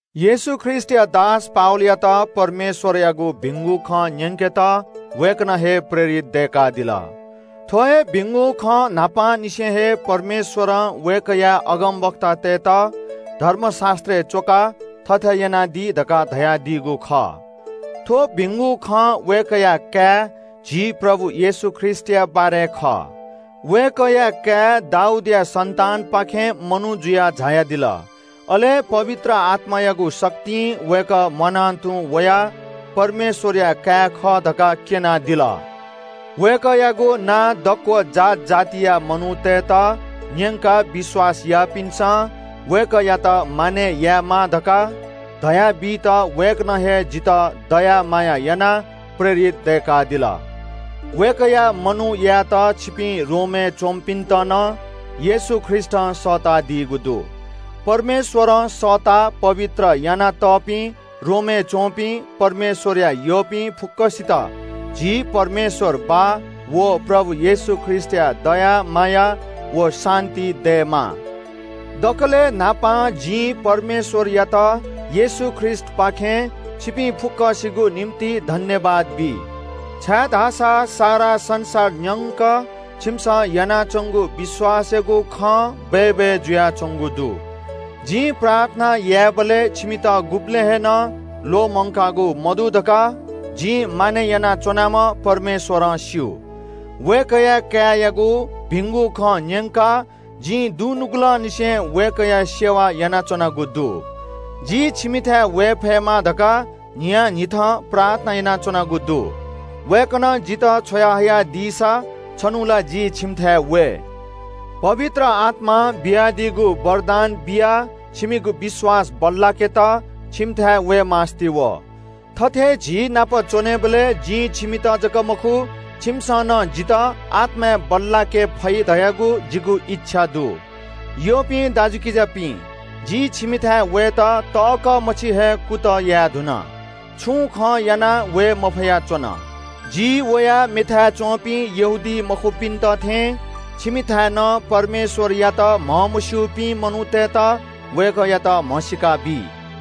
येशू ख्रीष्‍टया दास जि पावलयात परमेश्‍वरयागु भिंगु खँ न्‍यंकेत वय्‌कलं हे प्रेरित दय्‌कादिल। थ्‍व हे भिंगु खँ न्‍हापांनिसें हे परमेश्‍वरं वय्‌कःया अगमवक्तातय्‌त धर्मशास्‍त्रय् च्‍वकाः थथे यानादी धकाः धयादीगु खः। थ्‍व भिंगु खँ वय्‌कःया काय् झी प्रभु येशू ख्रीष्‍टया बारे खः। वय्‌कःया काय् दाऊदया सन्‍तानपाखें मनू जुयाः झायादिल। अले पवित्र आत्‍मायागु शक्तिं वय्‌कः म्‍वाना तुं वयाः परमेश्‍वरया काय् खः धकाः क्‍यनादिल। वय्‌कःयागु नां दक्‍व जात जातिया मनूतय्‌त न्‍यंकाः विश्‍वास याःपिन्‍सं वय्‌कःयात मानय् यायेमाः धकाः धया बीत वय्‌कलं हे जिमित दया माया यानाः प्रेरित दय्‌कादिल। वय्‌कःया मनूत यायेत छिपिं रोमय् च्‍वंपिन्‍त नं येशू ख्रीष्‍टं सःतादीगु दु। परमेश्‍वरं सःताः पवित्र यानातःपिं रोमय् च्‍वंपिं परमेश्‍वरया यःपिं फुक्‍कसित छिमित झी परमेश्‍वर बाः व प्रभु येशू ख्रीष्‍टया दया माया व शान्‍ति दयेमा। दकलय् न्‍हापां जिं परमेश्‍वरयात येशू ख्रीष्‍टपाखें छिपिं फुक्‍कसिगु निंतिं सुभाय् बी, छाय्‌धाःसा सारा संसार न्‍यंक छिमिसं यानाच्‍वंगु विश्‍वासयागु खँ बय्‌बय् जुयाच्‍वंगु दु। जिं प्रार्थना यायेबलय् छिमित गुबलें हे नं ल्‍वःमंकागु मदु धकाः जिं मानय् यानाच्‍वनाम्‍ह परमेश्‍वरं स्‍यू। वय्‌कःया काय्‌यागु भिंगु खँ न्‍यंकाः जिं दुनुगलंनिसें वय्‌कःया सेवा यानाच्‍वनागु दु। जि छिमिथाय् वये फयेमा धकाः न्‍हियान्‍हिथं प्रार्थना यानाच्‍वनागु दु। वय्‌कलं जितः छ्वया हयादीसा छन्‍हु ला जि छिमिथाय् वये। पवित्र आत्‍मां बियादीगु वरदान बियाः छिमिगु विश्‍वास बल्‍लाकेत छिमिथाय् वये मास्‍ति वः। थथे झीनाप च्‍वनेबलय् जिं छिमित जक मखु, छिमिसं नं जितः आत्‍माय् बल्‍लाके फइ धयागु जिगु इच्‍छा दु। यःपिं दाजुकिजापिं, जि छिमिथाय् वयेत तःकः मछि हे कुतः याये धुन। छुं खं यानाः वये मफया च्‍वन। जि वयाः मेथाय् च्‍वंपिं यहूदीमखुपिन्‍त थें छिमिथाय् नं परमेश्‍वरयात म्‍हमस्‍यूपिं मनूतय्‌त वय्‌कःयात म्‍हसीका बी।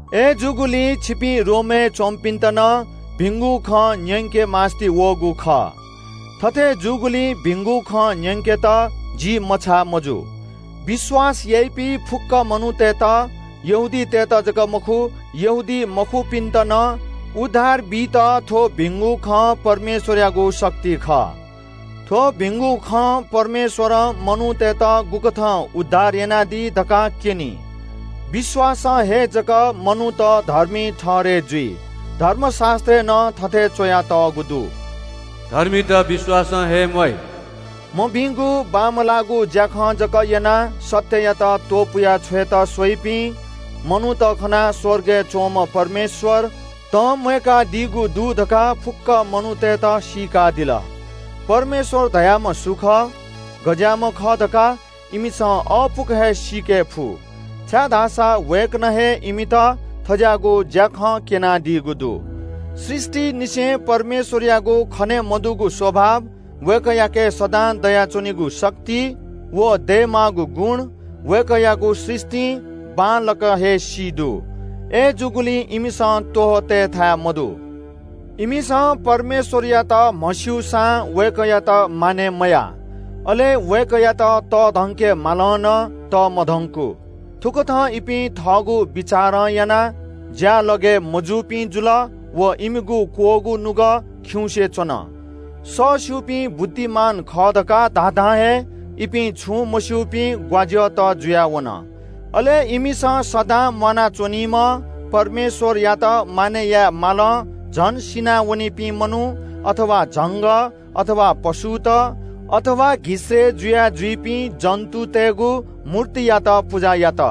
अय्‌जूगुलिं छिपिं रोमय् च्‍वंपिन्‍त नं भिंगु खँ न्‍यंके मास्‍ति वःगु खः। थथे जूगुलिं भिंगु खँ न्‍यंकेत जि मछाः मजू। छाय्‌धाःसा विश्‍वास याइपिं फुक्‍कसितं, न्‍हापालाक यहूदीतय्‌त अले यहूदीमखुपिन्‍त नं उद्धार बीत थ्‍व भिंगु खँ परमेश्‍वरयागु शक्ति खः। थ्‍व भिंगु खँ परमेश्‍वरं मनूतय्‌त गुकथं उद्धार यानादी धकाः क्‍यनी। विश्‍वासं हे जक मनूत धर्मी ठहरय् जुइ। धर्मशास्‍त्रय् नं थथे च्‍वयातःगु दु – “धर्मीत विश्‍वासं हे म्‍वाइ।” मभिंगु बांमलाःगु ज्‍याखँ जक यानाः सत्‍ययात त्‍वपुया छ्वयेत स्‍वइपिं मनूत खनाः स्‍वर्गय् च्‍वंम्‍ह परमेश्‍वर तंम्‍वय्‌कादीगु दु धकाः फुक्‍क मनूतय्‌त सीकादिल। परमेश्‍वर धाःम्‍ह सु खः, गज्‍याःम्‍ह खः धकाः इमिसं अःपुक हे सीके फु, छाय्‌धाःसा वय्‌कलं हे इमित थज्‍याःगु ज्‍याखँ क्‍यनादीगु दु। सृष्‍टिंनिसें परमेश्‍वरयागु खने मदुगु स्‍वभाव, वय्‌कःयाके सदां दयाच्‍वनीगु शक्ति, व दयेमाःगु गुण, वय्‌कःयागु सृष्‍टिं बांलाक हे सी दु। अय्‌जूगुलिं इमिसं त्‍वहः तयेथाय् मदु। इमिसं परमेश्‍वरयात म्‍हस्‍यूसां वय्‌कःयात मानय् मयाः। अले वय्‌कःयात तःधंके मालं नं तःमधंकू। थुकथं इपिं थःगु बिचारं यानाः ज्‍यालगय् मजूपिं जुल व इमिगु बुद्धि मदुगु नुगः खिउँसे च्‍वन। सःस्‍यूपिं बुद्धिमान खः धकाः धाधां हे इपिं छुं मस्‍यूपिं मूर्ख जुयाः वन। अले इमिसं सदां म्‍वाना च्‍वनीम्‍ह परमेश्‍वरयात मानय् याये मालं झन नाश जुयावनीपिं मनू, झंगः, पशुत व घिसय्‌ जुया जुइपिं जन्‍तुतय्‌गु मूर्तियात पुजा यात।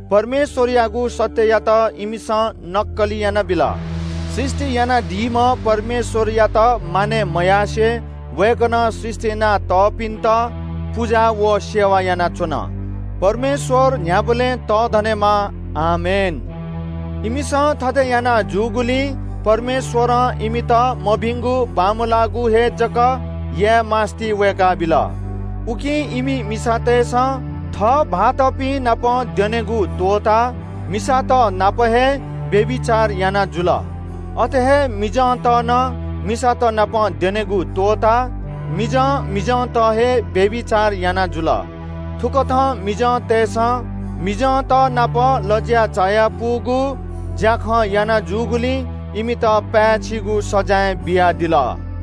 परमेश्‍वरयागु सत्‍ययात इमिसं मखुगु खँनापं हिलाः सृष्‍टि यानादीम्‍ह परमेश्‍वरयात मानय् मयासें वय्‌कलं सृष्‍टि यानातःपिन्‍त पुजा व सेवा यानाच्‍वन। परमेश्‍वर न्‍ह्याबलें तःधनेमा। आमेन। इमिसं थथे याना जूगुलिं परमेश्‍वरं इमित मभिंगु बांमलाःगु हे जक याना जुइत त्‍वःतादिल। उकिं इमि मिसातय्‌सं थः भाःतपिं नाप द्यनेगु त्‍वःताः मिसात नाप हे व्‍यभिचार याना जुल। अथे हे मिजंत नं मिसात नाप द्यनेगु त्‍वःताः मिजं मिजंत हे व्‍यभिचार याना जुल। थुकथं मिजंतय्‌सं मिजंतनाप लज्‍या चायापुगु ज्‍याखँ याना जूगुलिं इमित पाय्‌छिगु सजाँय बियादिल।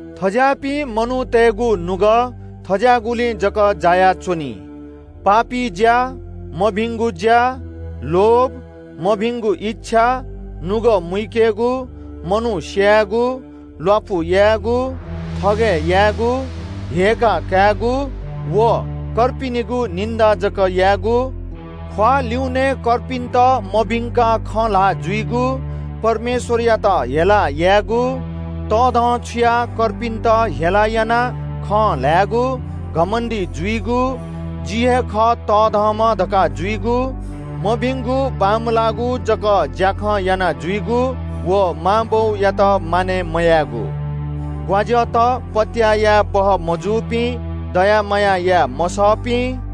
थज्‍याःपिं मनूतय्‌गु नुगः थज्‍याःगुलिइ जक जायाच्‍वनी – पापी ज्‍या, मभिंगु ज्‍या, लोभ, मभिंगु इच्‍छा, नुगः मुइकेगु, मनू स्‍यायेगु, ल्‍वापु यायेगु, थगय् यायेगु, हेय्‌काः कायेगु व कर्पिन्‍त क्‍वह्यंकेगु, ख्‍वाः ल्‍युने कर्पिन्‍त मभिंकाः खँ ल्‍हाः जुइगु, परमेश्‍वरयात हेला यायेगु, तःधंछुयाः कर्पिन्‍त हेला यानाः खँ ल्‍हायेगु, घमण्‍डी जुइगु, जि हे खः तःधंम्‍ह धकाः जुइगु, मभिंगु बांमलाःगु जक ज्‍याखँ यानाजुइगु व मां बौयात मानय् मयायेगु। बुद्धि मदुपिं, पत्‍याः याये बहःमजूपिं, दया माया याये मसःपिं,